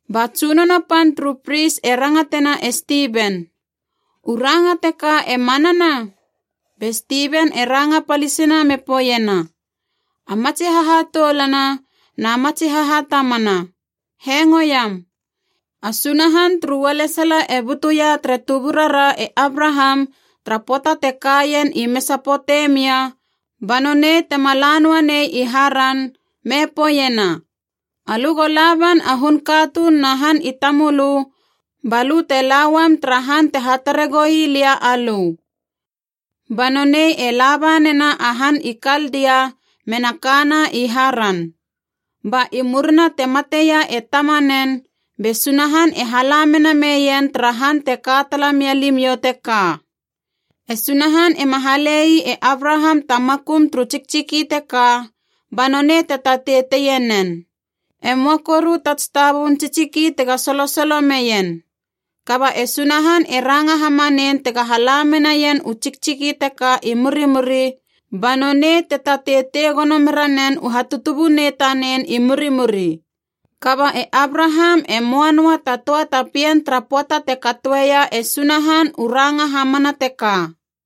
Ba tsunono pan turu pris e rangatena e Stiven, “U ranga teka e manana?” Be Stiven e ranga palisina me poeiena, “A matsi hahatoulana na matsi hahatamana, hengo iam! A Sunahan turu ualesala e butuia tere tuburara e Abraham tara pöata te ka ien i Mesapotemia ba nonei tema la noanei i Haran, me poeiena, ‘Alö go laban a hun katuun na han i tamölö ba lö te lauam tara han te hatare goi lia alö.’ Ba nonei e laba nena a han i Kaldia mena kana i Haran. Ba i murina te mateia e tamanen, be Sunahan e hala mena meien tara han te ka tala mia limiou teka. “E Sunahan ema hale ii e Abraham ta makum turu tsiktsiki teka ba nonei te tatei teie nen. E möa koru ta tsitabubun tsiktsiki tega solosolo meien. Kaba e Sunahan e ranga hamanein tega hala menaien u tsiktsiki teka i murimuri, ba nonei te tatei tei gono mera nen u hatutubunei tanen i murimuri. Kaba e Abraham e möa noa ta töa ta pien tara pöata te katoeia e Sunahan u ranga hamana teka.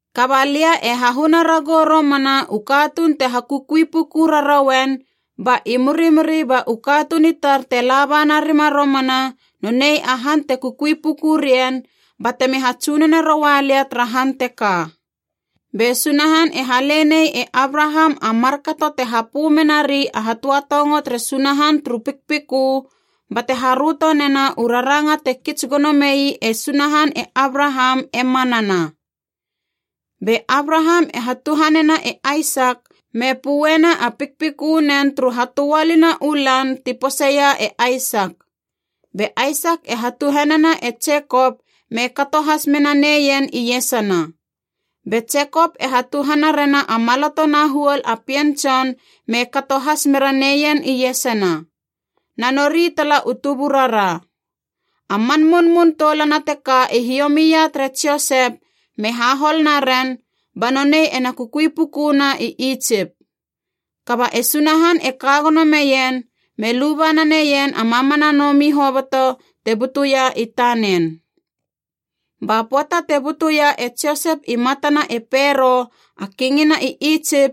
Kaba lia e hahuna ragou romana u katuun te hakukui puku rarouen, ba i murimuri ba u katuun i tar te laba narima romana nonei a han te kukui puku rien batemi hatsunone roua lia tara han teka.’ Be Sunahan e hale nei e Abraham a markato te hapö menari a hatöatongo tere Sunahan turu pikpikö, bate haröto nena u raranga te kits gono mei e Sunahan e Abraham e manana. Be Abraham e hatuhanena e Aisak me pöena a pikpikönen turu hatöalina u lan ti poseia e Aisak. Be Aisak e hatuhanena e Jekop me kato has mena neien iesana. Be Jekop e hatuhana rena a maloto na huol a pien tson me kato has mera neien iesana. Na nori tala u tuburara. “A man munmun toulana teka i hiomia tere Josep me hahol naren, ba nonei ena kukui pukuna i Itsip. Kaba e Sunahan e ka gono meien, me luba naneien a mamana nomi hoboto te butuia i tanen. Ba pöata te butuia e Josep i matana e Pero a Kingina i Itsip,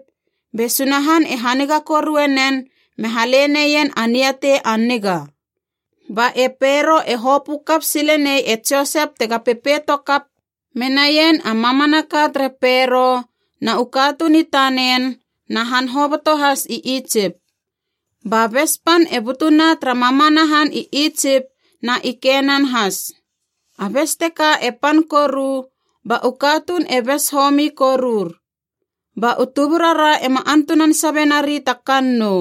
be Sunahan e haniga korue nen me hale neien a niatei a niga. Ba e Pero e hopö kap sile nei e Josep tega pepeito kap menaien a mamanaka tere Pero na u katuun i tanen na han hoboto has i Itsip. Ba bes pan e butuna tara mamana han i Itsip na i Kenan has. A bes teka e pan koru, ba u katuun e bes homi korur. Ba u tuburara ema antunan sabe nari ta kannou.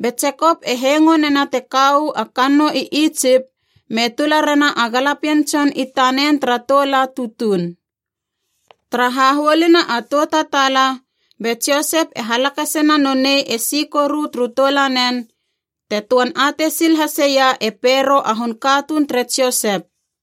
Be Jekop e hengo nena te ka uu a kannou i Itsip, me tula rena a galapien tson i tanen tara tou la tutuun. Tara hahuoluna a tou tataala, be Josep e halakasena nonei e si koru turu toulanen, te töan atei sil haseia e Pero a hun katuun tere Josep.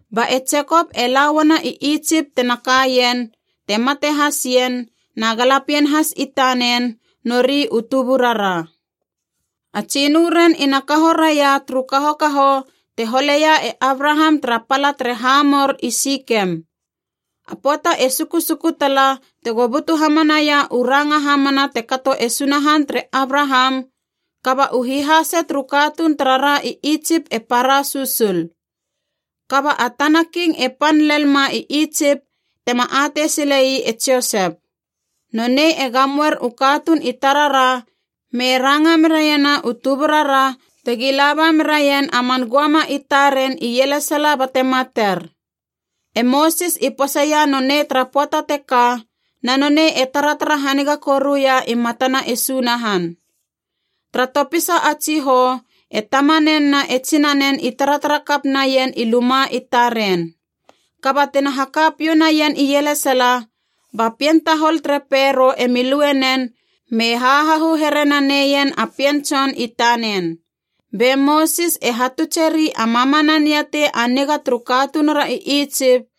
Ba e Jekop e la uana i Itsip tena kaien, te mate has ien, na galapien has i tanen, nori u tuburara. A tsinö ren ina kaho raia turu kahokaho te holeia e Abraham tara pala tere Hamor i Sikem. “A pöata e sukusuku tala tego butu hamanaia u ranga hamana te kato e Sunahan tere Abraham, kaba u hihase turu katuun tarara i Itsip e para susul. Kaba a tana king e pan lel ma i Itsip tema atei silei e Josep. Nonei e gamoer u katuun i tarara me ranga meraiena u tuburara tegi laba meraien a man göama i taren ielesala bate mater. E Mosis i poseia nonei tara pöata teka na nonei e taratara haniga koruia i matana e Sunahan. Tara topisa a tsihou e tamanen na e tsinanen i taratara kap naien i luma i taren. Kaba tina haka piou naien ielesala, ba pien tahol tere Pero emi lue nen me hahahu here naneien a pien tson tanen. Be Mosis e hatutseri a mamana niatei a niga turu katunura i Itsip,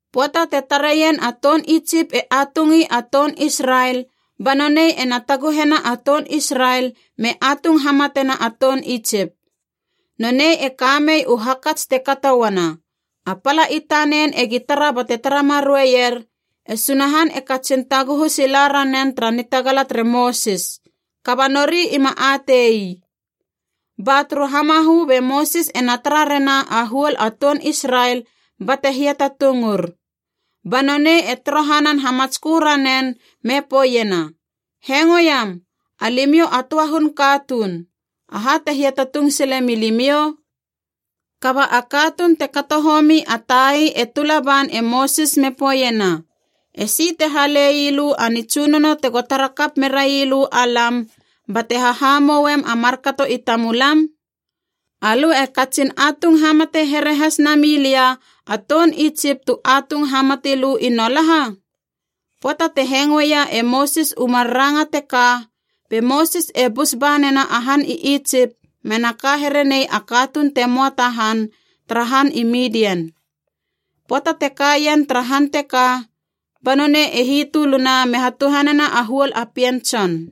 Pöata te tareien a toun Itsip e atungi a toun Israel ba nonei ena taguhena a toun Israel me atung hamatena a toun Itsip. Nonei e kamei u hakats te kato uana, a pala i tanen egi tara bate tara marueier, e Sunahan e katsin taguhu sila ranen tara nitagala tere Mosis. Kaba nori ima ate ii. “Ba turu hamahö be Mosis ena tara rena a huol a toun Israel bate hiatatungur. Ba nonei e torohanan hamatskö ranen me poeiena, ‘Hengoiam! Alimiou a töa hun katuun. Aha te hiatatung sile milimiou?’ Kaba a katuun te kato homi a tai e tula ban e Mosis me poeiena, ‘E si te hale ii lö a nitsunono tego tara kap merailö alam bate hahamouem a markato i tamulam? Alö e katsin atung hamate here has nami lia a toun Itsip tu atung hamati lö i nolaha?’ Pöata te hengoeia e Mosis u mar ranga teka be Mosis e bus ba nena a han i Itsip mena ka here nei a katuun te moa ta han tara han i Midian. Pöata te ka ien tara han teka ba nonei e hitöluna me hatuhanena a huol a pien tson.”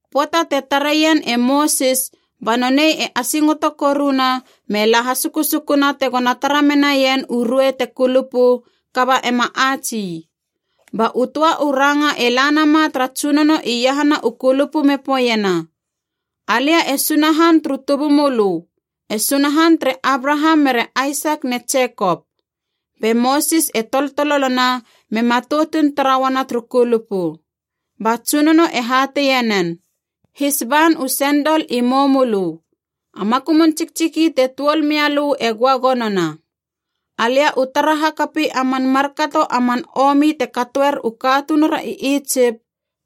Pöata te tareien e Mosis ba nonei e asingoto koruna me la hasukusukuna tegona tara menaien u ruei te kulupu kaba ema ats ii. Ba u töa u ranga e la nama tara Tsunono iahana u kulupu me poeiena, ‘Alia e Sunahan turu tubumölö, e Sunahan tere Abraham mere Aisak ne Jekop.’ Be Mosis e toltololona me matoutun tara uana turu kulupu. Ba Tsunono e hateie nen, ‘His ban u sendol i moumölö. A makumun tsiktsiki te tuol mia lö e göagonona. Alia u tara hakapi a man markato a man omi te katoer u katunura i Itsip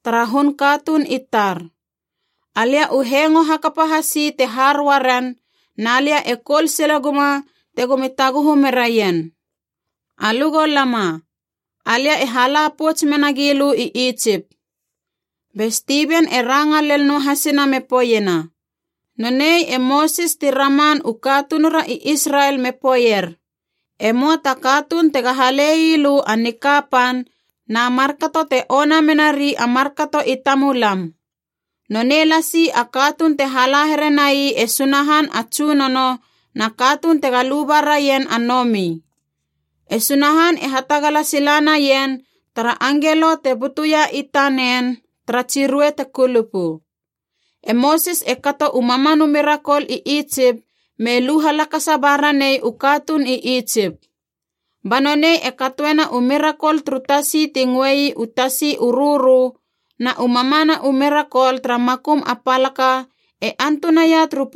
tara hun katuun i tar. Alia u hengo hakapa hasi te har uaren, na lia e koul sile guma tegomi taguhu meraien. Alö go lama. Alia e hala pouts mena gilö i Itsip.’” Be Stiven e ranga lel noa hasina me poeiena, “Nonei e Mosis ti raman u katunura Israel me poeier, ‘E möa ta katuun tega hale ii lö a nikapan na markato te ona menari markato i tamulam!’ Nonei lasi a katuun te hala here nai e Sunahan a tsunono na katuun tega luba raien a nomi. E Sunahan e hatagala sila naien tara angelo te butuia i tanen tara tsi ruei te kulupu. E Mosis e kato u mamana mirakol i Itsip me lu halakasa ba ranei u katuun i Itsip. Ba nonei e katoena u mirakol turu tasi ti ngöei u Tasi u Rörö na u mamana u mirakol tara makum a palaka e antunaia turu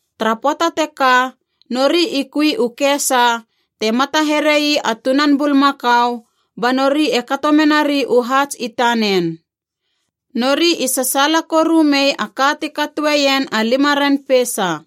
Tara pöata teka nori i kui u kesa te mata here ii a tunan bulmakau ba nori e kato menari u haats i tanen. Nori i sasaala koru mei a ka ti katoeien a lima ren peisa.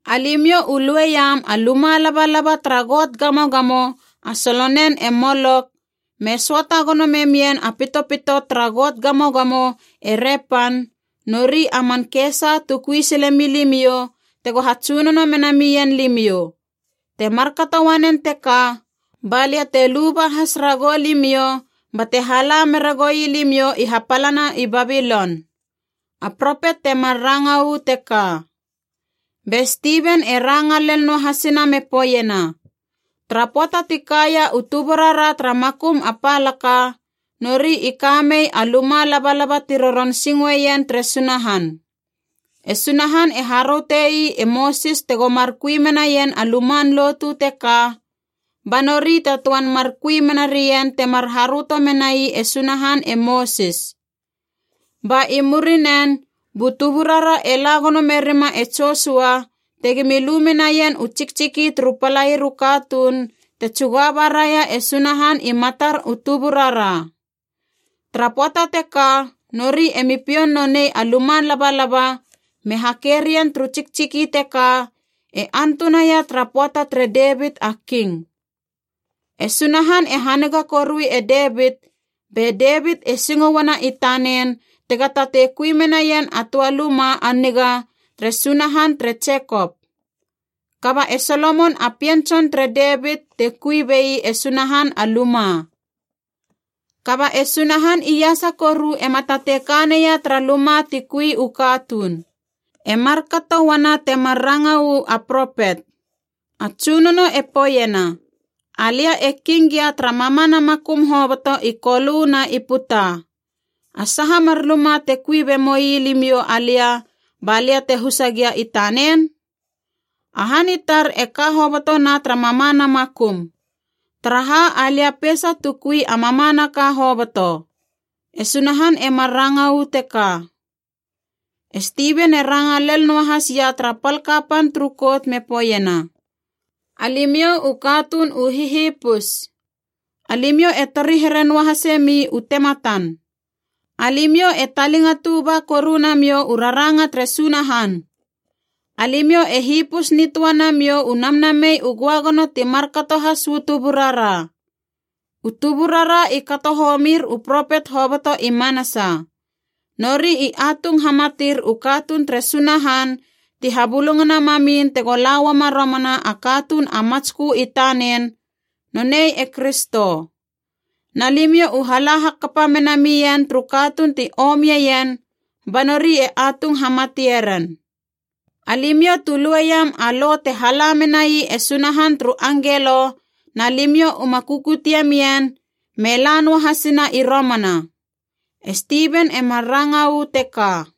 Alimiou u lue iam a luma labalaba tara got gamogamo a solonen e Molok, me söata gono memien a pitopito tara got gamogamo e Repan, nori a man kesa tu kui sile milimiou tego hatsunono mena mien limiou. Te markato uanen teka balia te luba has ragou limiou bate hala mera goilimiou i hapalana i Babilon.’ “A propet temar ranga uu teka.” Be Stiven e ranga lel noa hasina me poeiena, “Tara pöata ti kaia u tuburara tara makum a palaka, nori i ka mei a luma labalaba ti roron singoien tere Sunahan. E Sunahan e haröte ii e Mosis tego mar kui menaien a luman lotu teka, ba nori te töan mar kui mena rien temar haröto menai e Sunahan e Mosis. Ba i murinen bu tuburara e la gono merima e Josua tegimi lu menaien u tsiktsiki turu palair u katuun te tsuga baraia e Sunahan i matar u tuburara. Tara pöata teka nori emi pioun nonei a luma labalaba me hakei rien turu tsiktsiki teka e antunaia tara pöata tere Devit a King. “E Sunahan e haniga korui e Devit, be Devit e singo uana i tanen tega tatei kui menaien a töa luma a niga tere Sunahan tere Jekop. Kaba e Solomon a pien tson tere Devit te kui bei e Sunahan a luma. “Kaba e Sunahan Iasa Koru ema tatei ka neia tara luma ti kui u katuun. E markato uana temar ranga uu a propet: ‘A Tsunono e poeiena, Alia e king gia tara mamana makum hoboto i Kolö na i puta. A saha mar luma te kui be moi limiou alia ba lia te husa gia i tanen? A han i tar e ka hobotona tara mamana makum, taraha alia peisa tu kui a mamanaka hoboto.’ “E Sunahan e mar ranga uu teka.” E Stiven e ranga lel noahas ia tara pal kapan turu Kout me poeiena, “Alimiou u katuun u hihipus! Alimiou e tori here noa hasemi u tematan! Alimiou e talingatu ba koru namiou u raranga tere Sunahan! Alimiou e hipus nitöa namiou u Namnamei u Göagono ti markato has uu tuburara! U tuburara i kato homir u propet hoboto i manasa. Nori i atung hamatir u katuun tere Sunahan ti habulungana mamin tego la uama romana a Katuun a Matskö i tanen, nonei e Kristo. Na limiou u hala hakapa mena mien turu katuun ti omieien ba nori e atung hamatie ren. Alimiou tu lue iam a Lo te hala menai e Sunahan turu angelo, na limiou uma kukutie mien te la noa hasina i romana!” E Stiven e mar ranga uu teka.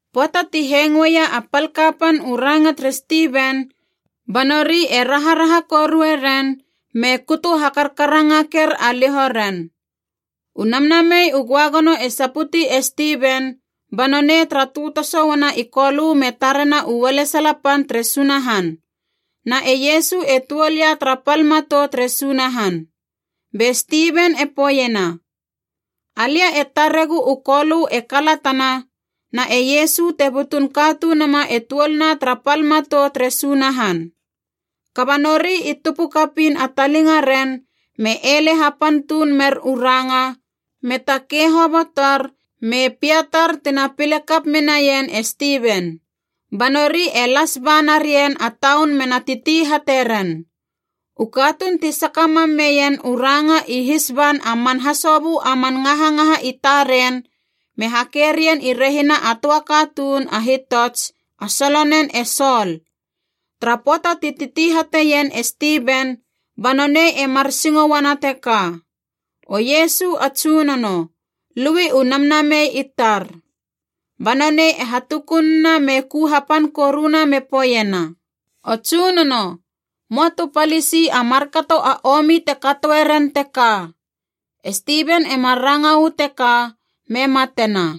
Pöata ti hengoeia a pal kapan u ranga tere Stiven, ba nori e raharaha korue ren me kutu ha karkarangaker a liho ren. U Namnamei u Göagono e saputi e Stiven, ba nonei tara tötoso uana i Kolö me tarena u ualesala pan tere Sunahan, na e Iesu e tuol ia tara pal matou tere Sunahan. Be Stiven e poeiena, “Alia e taregu u Kolö e kalatana na e Iesu te butun Katunuma e tuolna tara pal matou tere Sunahan!” Kaba nori i tupu kapiin a talingaren me ele hapan tuun mer u ranga, me takei hobotor me piatar tina pile kap menaien e Stiven. Ba nori e las ba na rien a taun mena titi hate ren. U katuun ti saka mam meien u ranga i his ban a man hasobö a man ngahangaha i taren me hakei rien i rehina a töa katuun a hitots a solonen e Sol. Tara pöata ti titi hateien e Stiven, ba nonei e mar singo uana teka, “O Iesu a Tsunono, lui u namnamei i tar!” Ba nonei e hatukununa me ku hapan koruna me poeiena, “O Tsunono, moa tu palisi a markato a omi te katoeren teka!” E Stiven e mar ranga uu teka me matena.